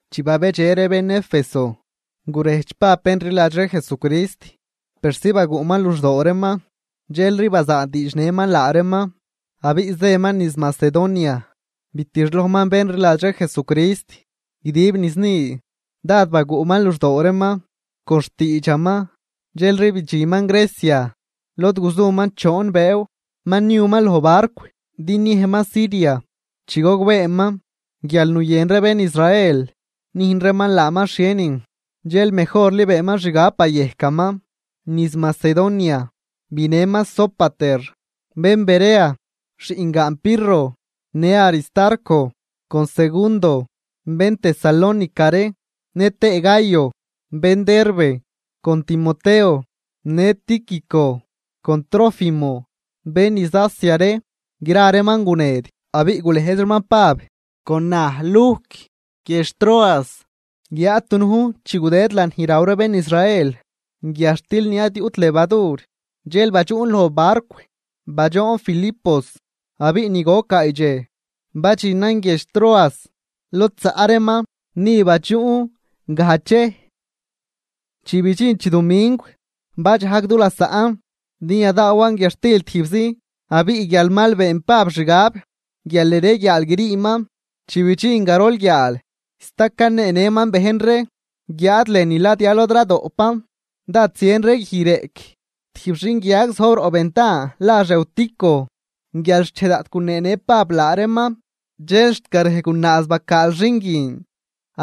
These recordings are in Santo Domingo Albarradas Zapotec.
Chi babedxe ree bén Éfeso, gurejdx Pab bén rliladx ree Jesucrist persi baguꞌman luxdoo reeman. Dxelri bazaadiidxnëman laa reeman abiꞌ zëman niz Macedonia. Bitixlojman bén rliladx ree Jesucrist guidib niz ni, dád baguꞌman luxdoo reeman con xtiidxaman, dxelri bidxinman Grecia lod guzuman choon bëëw. Ma niuman loj barcw din niejman Siria, chi gogbeeman guial nuyën ree bén Israel nüjn reeman laaman xhienin. Dxel mejorli beenman xgab bayejcaman niz Macedonia. Binëman Sópater, bén Berea, xiꞌngaan Pirro, në Aristarco con Segundo, bén Tesalónica ree, nëtëë Gayo, bén Derbe, con Timoteo, në Tíquico con Trófimo, bén niz Asia ree. Gra reeman guned abiꞌ gulëjz reeman Pab con naj Lujc guiedx Troas. Guiáad dunujn chi gudëd lanij ni raw ree bén Israel guiadxtil ni ad yuꞌt levadur, dxel badxuꞌn loj barcw badxoon Filipos, abiꞌ ni goc gaay dxej badxinan guiedx Troas lod zaꞌ reeman. Ni badxuꞌn gajdx dxej. Chi bidxin chidumingw, badxajg du lasaꞌn din yadaawan guiadxtil tijbzi, abiꞌ guial mal been Pab xgab guial yareguiaal griiman, chi bidxin garol guiaal sta caneenëman bejn ree, guiáad lënü ladya lod radoꞌpan dád zien ree guij reꞌc. Tijb xinguiag zojb roꞌ ventan lax Eutico. Guial xchej daꞌt guneenë Pab laa reeman, dxel xt garej gunaaz bacaal xin guin,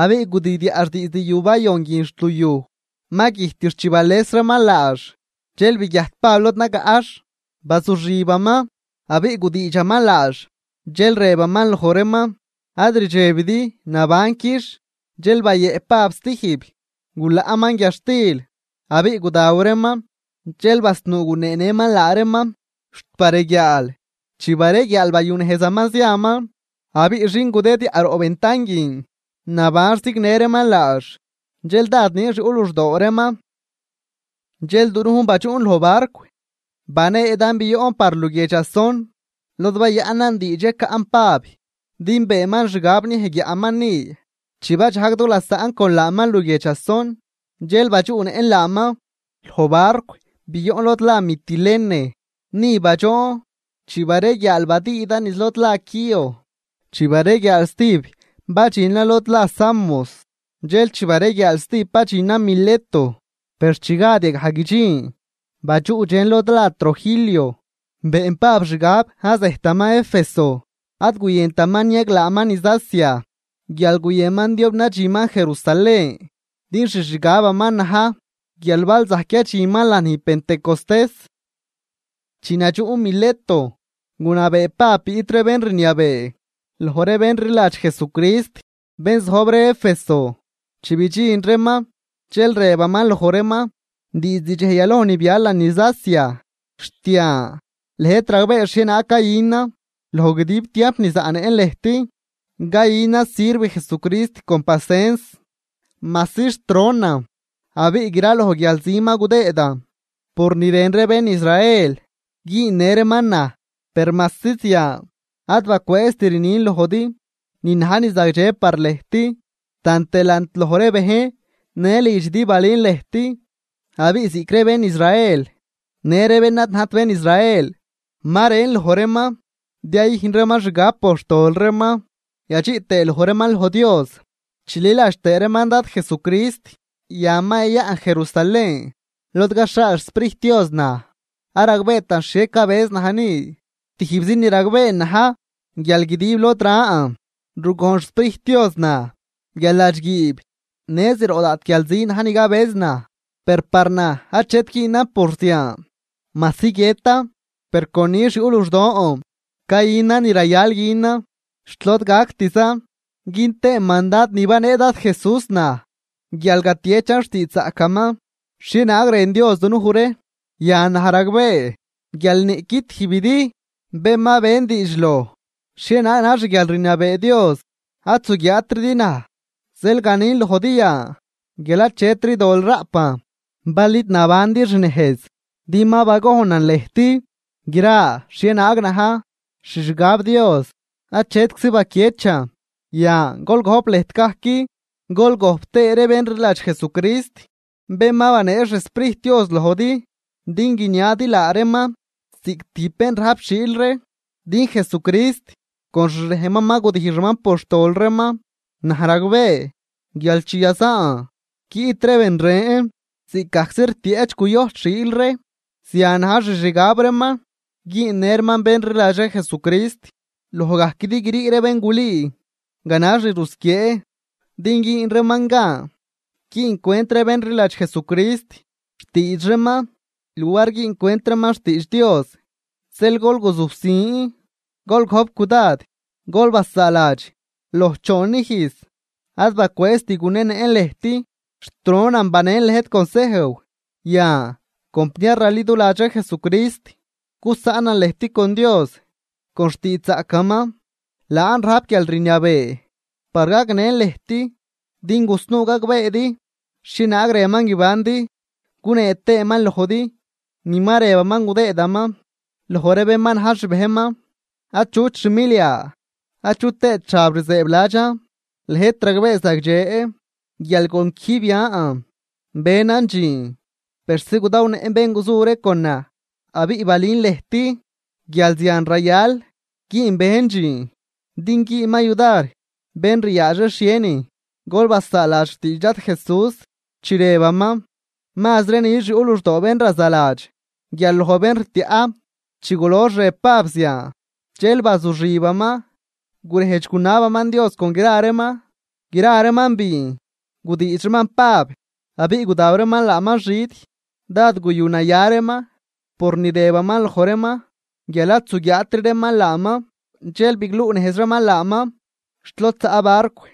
abiꞌ gudidyaꞌx diizd yu bayon guin xt luyuj, ma güjtix chi bales reeman laax. Dxel biguiajt Pab lod nagaꞌx, bazuxibaman abiꞌ gudiidxaman laax, dxel rëbaman loj reeman: ―Ad rdxebidi, nabanquix. Dxel bayëꞌp Pab zatijb, gulaꞌman guiadxtil abiꞌ gudaw reeman, dxel basnuu guneenëman laa reeman xt bareguiaal. Chi bareguiaal bayunejzaman ziaman. Abiꞌ xin gudidyaꞌ roꞌ ventan guin, nabanx zignë reeman laax, dxel dád nix yuꞌ luxdoo reeman. Dxel dunujn badxuꞌn loj barcw baneedan bioꞌn par luguiedx Asón, lod bayaꞌnan diidx yacaꞌn Pab, din beenman xgab niej guiaꞌman ni. Chi badxajg du lasaꞌn con laaman luguiedx Asón, dxel badxuꞌnëꞌn laaman loj barcw bioꞌn lod la Mitilene. Ni badxoon, chi bareguiaal badüüdan niz lod la Quío. Chi bareguiaal stijb badxinan lod la Samos. Dxel chi bareguiaal stijb badxinan Mileto, per chi gad yagaj guidxin badxuꞌdxen lod la Trogilio. Been Pab xgab ad zejtaman Éfeso, ad guyëntaman niaglaaman niz Asia guial nuyënman diob nadxinman Jerusalén, din xixgabaman na̱j guial bal zajc yadxinman lanij Pentecostés. Chi nadxuꞌn Mileto, gunabee Pab biꞌt ree bén rniabee loj ree bén rliladx Jesucrist, bén zojb ree Éfeso. Chi bidxin reeman dxel rëbaman loj reeman: ―Diizd dxej yaloj ni bialan niz Asia xt yan, lëjt ragbee xhienaag cayünan. Loj guidib tiamp ni zaꞌnëꞌn lëjt cayünan sirv Jesucrist con pasens, majsi xt ronan abiꞌ gra loj guialzi ma gudëëdan por ni rën ree bén Israel güünnë reeman naj. Per majsi zian ad bacwëëzt rnin lojdi ni na̱j ni zagdxe par lëjt, tant delant loj ree bejn në lidxidi balün lëjt. Abiꞌ ziꞌc ree bén Israel në ree bén ad najt bén Israel, ma rën loj reeman din yayüjn reeman xgab por xtol reeman yadxiꞌ tëë loj reeman loj Dios chililadx tëë reeman Dad Jesucrist. Yan ma yayaꞌn Jerusalén lod caxhaal xSprijt Dios naj, ad ragbeetan xhie cabëz naj ni. Tijbzi ni ragbeen na̱j guial guidib lod ran rugojn xSprijt Dios naj guial ladxguiib në zroꞌ daꞌt guialzi na̱j ni cabëz naj. Per par naj achet güünan por zian, majsi guiëtan per con nix yuꞌ luxdon cayünan ni rayal günan xt lod gactizan, gün tëën mandad ni banee Dad Jesús naj guial gatiechan xtiidxzaꞌcaman xhienaag rën Dios dunuj ree. ’Yan naj ragbee guial niꞌqui tijbidi bén ma ben diidx loj xhienaag na̱j xguialrniabee Dios, ad zuguiaatridi naj. Zeel ganin lojdi yan guial ad achetri dol raꞌpan bal id nabandi xnejz. Din ma bagojnan lëjt gra xhienaag na̱j xixgab Dios achetczi baquiechan. Yan, gol gojp lëjt gajc, gol gojp tëë ree bén rliladx Jesucrist, bén ma banee xSprijt Dios lojdi din guiniadi laa reeman ziꞌc tijb bén rajp xiil ree, din Jesucrist con xrejnman ma gudijxaman por xtol reeman. Naj ragbee guial chi yazaan guiꞌt ree ben ren ziꞌc gajczi rtieꞌch cuyojt xiil ree, zian na̱j xixgab reeman güünnë reeman bén rliladx ree Jesucrist. Loj gajquidi grii ree bén gulüü ganax ni rusquiee, din güün reeman gan güüncwent ree bén rliladx Jesucrist xtiidx reeman luar güüncwent reeman xtiidx Dios. Zeel gol guzujsin, gol gojp cudad, gol basaaladx, loj choon ijz ad bacwëëzt gunenëꞌn lëjt xt ronan banen lëjt consejw. ’Yan, compniar raliduladx ree Jesucrist, gusaꞌnan lëjt con Dios con xtiidxzaꞌcaman. Laan rajp guialrniabee par gagnën lëjt, din gusnuu gagbeedi xhienaag rënman guibandi gunee tëëman lojdi ni ma rëbaman gudëëdaman loj ree bén ma na̱j xbejnman. Achut xmilia achu tëët xab rzëëbladxan. Lëjt ragbee zagdxe guial con quijb yan benan dxiin persi gudawnëꞌn bén guzu ree con naj. Abiꞌ balün lëjt guial zian rayal güün bejn dxiin din güünman yudar bén ryaadx ree xhienin. Gol basaaladx xtiidx Dad Jesús chi rëbaman: “Mazri nix yuꞌ luxdoo bén razaladx guial loj bén rtiaꞌ.” Chi gulox rëb Pab zian, dxel bazuxibaman gurejdx gunabaman Dios con gra reeman. Gra reeman biin, gudiidx reeman Pab abiꞌ gudaw reeman laaman xid. Dád guyunaya reeman por ni rëbaman loj reeman guial ad zuguiaatri reeman laaman. Dxel bigluꞌnejz reeman laaman xt lod zaꞌ barcw.